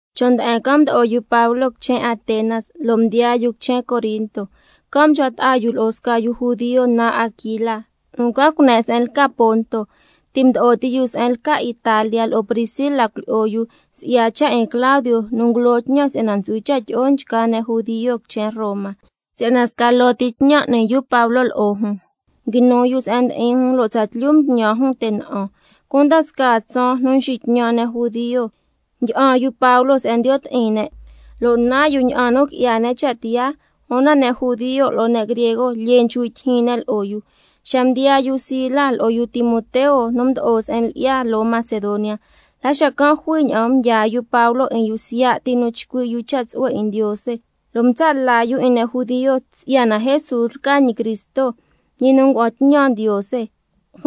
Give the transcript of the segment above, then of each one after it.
Chon' nde'en can' mdo'o yu Pablo quichen Atenas, lo' mdiyaa yu quichen Corinto. Can' mchcua ta'a yu lo'o sca yu judio naan Aquila nu ncua cune' se'en lca Ponto. Ti' mdo'o ti yu se'en lca Italia lo'o Priscila cuilyi'o yu, si'ya cha' 'in Claudio nu ngulo tñan si'yana ntsu'hui cha' tyi'o nchgaa ne' judio quichen Roma. Si'yana sca loo ti tñan n'ni yu Pablo lo'o jun, can' cha' nguinu yu se'en ndi'in jun, lo' tsatlyu mtñan jun te' na'an. Cunda scaa tsaan nu nxitñan' ne' judio, ndyi'an yu Pablo se'en ndiyo' ti'in ne' lo' nan yu ña'an nu qui'ya ne' cha' tiyaa, una ne' judio lo'o ne' griego lyee nchcui' tyijyin ne' lo'o yu. Xa mdiyaa yu Sila lo'o yu Timoteo nu mdo'o se'en lyi'ya loo Macedonia, la xacan' jui ña'an mdyaa yu Pablo 'in yu siya' ti nu chcui' yu cha' tsu'hue 'in Ndiose, lo' mtsa' la yu 'in ne' judio si'yana Jesús lca ñi Cristo, ñi nu ngua'an tñan Ndiose.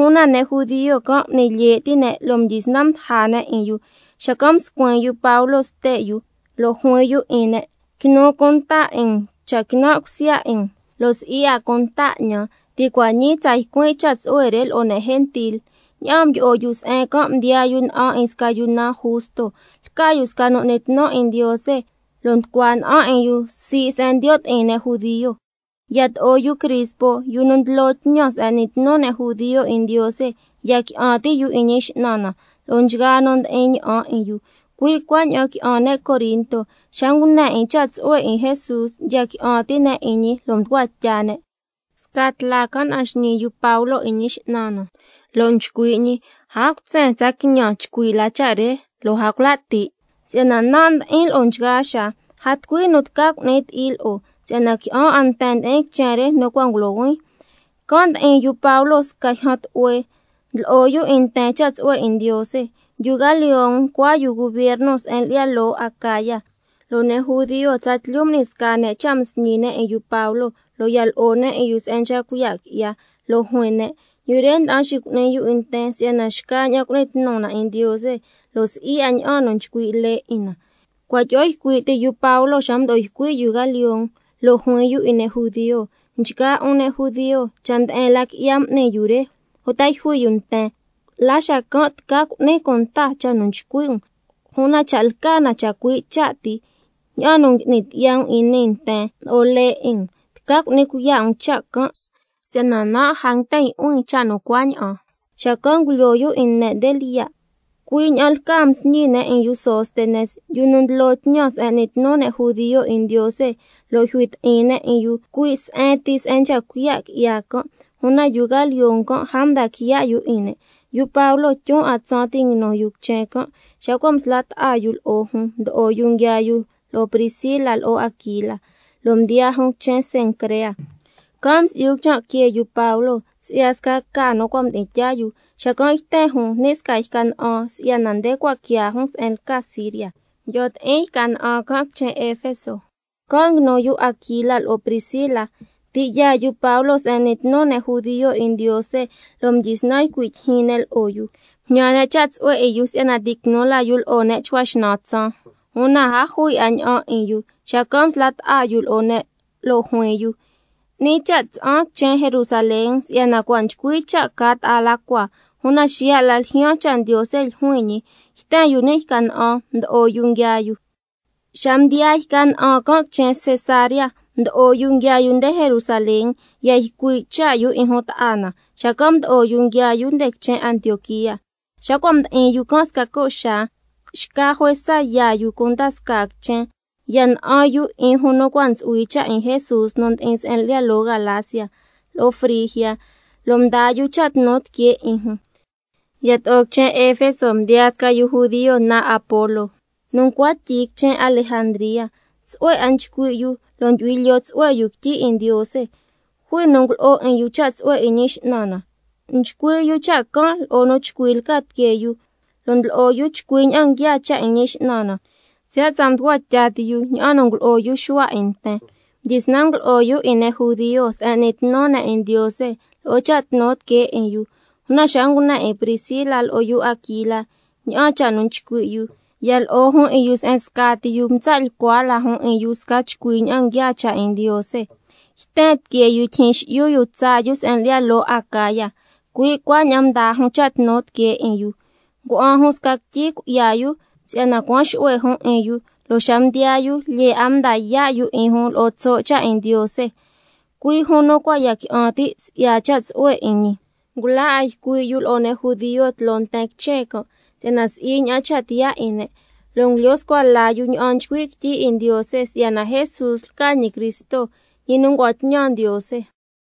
Una ne' judio can' m'ni lye' ti' ne', mdyisnan mdaja ne' 'in yu, xacan' mscuin yu Pablo ste' yu lo' juin yu 'in ne': Quinu cunta 'in um cha' quinan' cusya 'in um, lo' si'i 'a cunta 'ñan. Ti' cua' ñii tsa ycuin' cha' tsu'hue re lo'o ne' gentil. Ña'aan mdyi'o yu se'en can' mdiyaa yu na'an 'in sca yu naan Justo, lca yu sca nu n'ni tnu 'in Ndiose, lo' nducua na'an 'in yu sii' se'en ndiyo' ti'in ne' judio. Yato'o yu Crispo, yu nu ndlo tñan se'en n'ni tnu ne' judio 'in Ndiose, ya qui'an ti' yu 'in Ñi X'nan na lo'o nchgaa nu ndi'in ña'an 'in yu. Cui' cuaña'an qui'an ne' Corinto, xa ngune 'in cha' tsu'hue 'in Jesús ya qui'an ti' ne' 'in ñi, lo' mducua tya ne'. Sca tla can' na'an xñii yu Pablo 'in Ñi X'nan na, lo' nchcui' ñi: A cutsen, tsa quiñan chcui' la cha' re, lo' a cula' ti', si'yana nan' ndi'in lo'o nchgaa xaa, a tucui nu tca cu'ni ti'i lo'o, si'yana qui'an 'a nten ndi'in quichen re nu cua' ngulohuin. Can' mdi'in yu Pablo sca yjan tlu'hue, ndlo'o yu 'in nten cha' tsu'hue 'in Ndiose. Yu Galión ncua yu gubierno se'en lyi'ya loo Acaya, lo' ne' judio tsatlyu m'ni sca ne' cha' msñi ne' 'in yu Pablo, lo' ya lo'o ne' 'in yu se'en nchca cuiya' qui'ya, lo' juin ne': Yu re nda'an xicu'ni yu 'in nten si'yana xcaña'an cu'ni tnu na 'in Ndiose, lo' si'i 'a ña'an nu nchcui' lee 'in na. Cua' tyi'o ycui' ti yu Pablo xa mdo'o ycui' yu Galión, lo' juin yu 'in ne' judio: Nchgaa 'un ne' judio, cha' nde'en la qui'ya m'ni yu re, uta yjui yu nten, la xacan' tca cu'nin cunta cha' nu nchcui' um. Una cha' lca na chacui' cha' ti, ña'an nu ngui'ni tyi'ya um nii nten lo'o lee 'in um, tca cu'ni cuiya' um cha' can' ticui' ti um, si'yana nan' a nguiten yu'huin cha' nu cuaña'an. Xacan' ngulyoo yu 'in ne' nde lyiya'. Cui' ña'aan lca msñi ne' 'in yu Sóstenes, yu nu ndlo tñan se'en n'ni tnu ne' judio 'in Ndiose, lo' yjui ti'in ne' 'in yu cui' se'en ti se'en nchca cuiya' qui'ya can', una yu Galión can' a mda quiya' yu 'in ne'. Yu Pablo tyun 'a tsaan ti' nguinu yu quichen can'. Xa cua' msla' ta'a yu lo'o jun, mdo'o yu nguiaa yu lo'o Priscila lo'o yu Aquila, lo' mdiyaa jun quichen Cencrea, can' msi'yu quichan' que yu Pablo si'ya sca ca nu cua' mdi'in tyaa yu, xacan' yten jun ni' sca yca na'an si'yana nde cua' quiaa yu Pablo se'en lca Siria. Xacan' mdyi'o ti'in yca na'an can' quichen Efeso, can' nguinu yu Aquila lo'o Priscila. Ti' yaa yu Pablo se'en n'ni tnu ne' judio 'in Ndiose, lo' mdyisnan ycui' tyijyin ne' lo'o yu. Mjñan ne' cha' tsu'hue 'in yu si'yana ti' quinu la yu lo'o ne' chcua xnan tsaan, una a jui 'a ña'an 'in yu. Xacan' msla' ta'a yu lo'o ne' lo' juin yu: 'Ni cha' tsa'an quichen Jerusalén si'yana cua' nchcui cha' ca ta'a la cua, una xiya' la ljyaan cha' Ndiose ljuin ñi. Xacan' yten yu ni' yca na'an, mdo'o yu nguiaa yu. Xa mdiyaa yca na'an can' quichen Cesarea, mdo'o yu nguiaa yu nde Jerusalén, ya ycui' cha' yu 'in jun ta'a na, xacan' mdo'o yu nguiaa yu nde quichen Antioquía. Xa cua' mdi'in yu can' sca co' xaa, xca juesa yaa yu cunda scaa quichen, ya na'an yu 'in jun nu cua' ntsu'hui cha' 'in Jesús nu ndi'in se'en lyi'ya loo Galacia, lo'o Frigia, lo' mdaa yu cha' tnu tiquee 'in jun. Yato'o quichen Efeso mdiyaa sca yu judio naan Apolo, nu ncua tyi quichen Alejandría, tsu'hue 'a nchcui' yu, lo' ndyu'hui lyoo tsu'hue yu quityi 'in Ndiose. Jui nu ngulo'o 'in yu cha' tsu'hue 'in Ñi X'nan na, nchcui' yu cha' can' lo'o nu chcui lca tiquee yu, lo' ndlo'o yu chcui ña'an nguiaa cha' 'in Ñi X'nan na, siya' tsa mducua tya ti yu ña'an nu ngulo'o yu Xuhua 'in nten. Mdyisnan ngulo'o yu 'in ne' judio se'en n'ni tnu ne' 'in Ndiose lo'o cha' tnu tiquee 'in yu, una xa ngune 'in Priscila lo'o yu Aquila ña'an cha' nchcui' yu, ya lo'o jun 'in yu se'en scati yu, mtsa' lyicua la jun 'in yu sca chcui ña'an nguiaa cha' 'in Ndiose. Yten tiquee yu tyijyin xi'yu yu tsaa yu se'en lyi'ya loo Acaya, cui' cuaña'an mdaa jun cha' tnu tiquee 'in yu, xacan' ngua'an jun sca quityi cui'ya yu si'yana cuan xu'hue jun 'in yu, lo' xa mdiyaa yu lyee 'a mda yaa' yu 'in jun lo'o tso' cha' 'in Ndiose, cui' jun nu cua' ya qui'an ti' si'ya cha' tsu'hue 'in ñi. Ngula 'a ycui' yu lo'o ne' judio tloo nten quichen can', si'yana si'i ña'an cha' tiyaa 'in ne', lo' ngulyo scua la yu ña'an nchcui' quityi 'in Ndiose si'yana Jesús lca ñi Cristo, ñi nu ngua'an tñan Ndiose.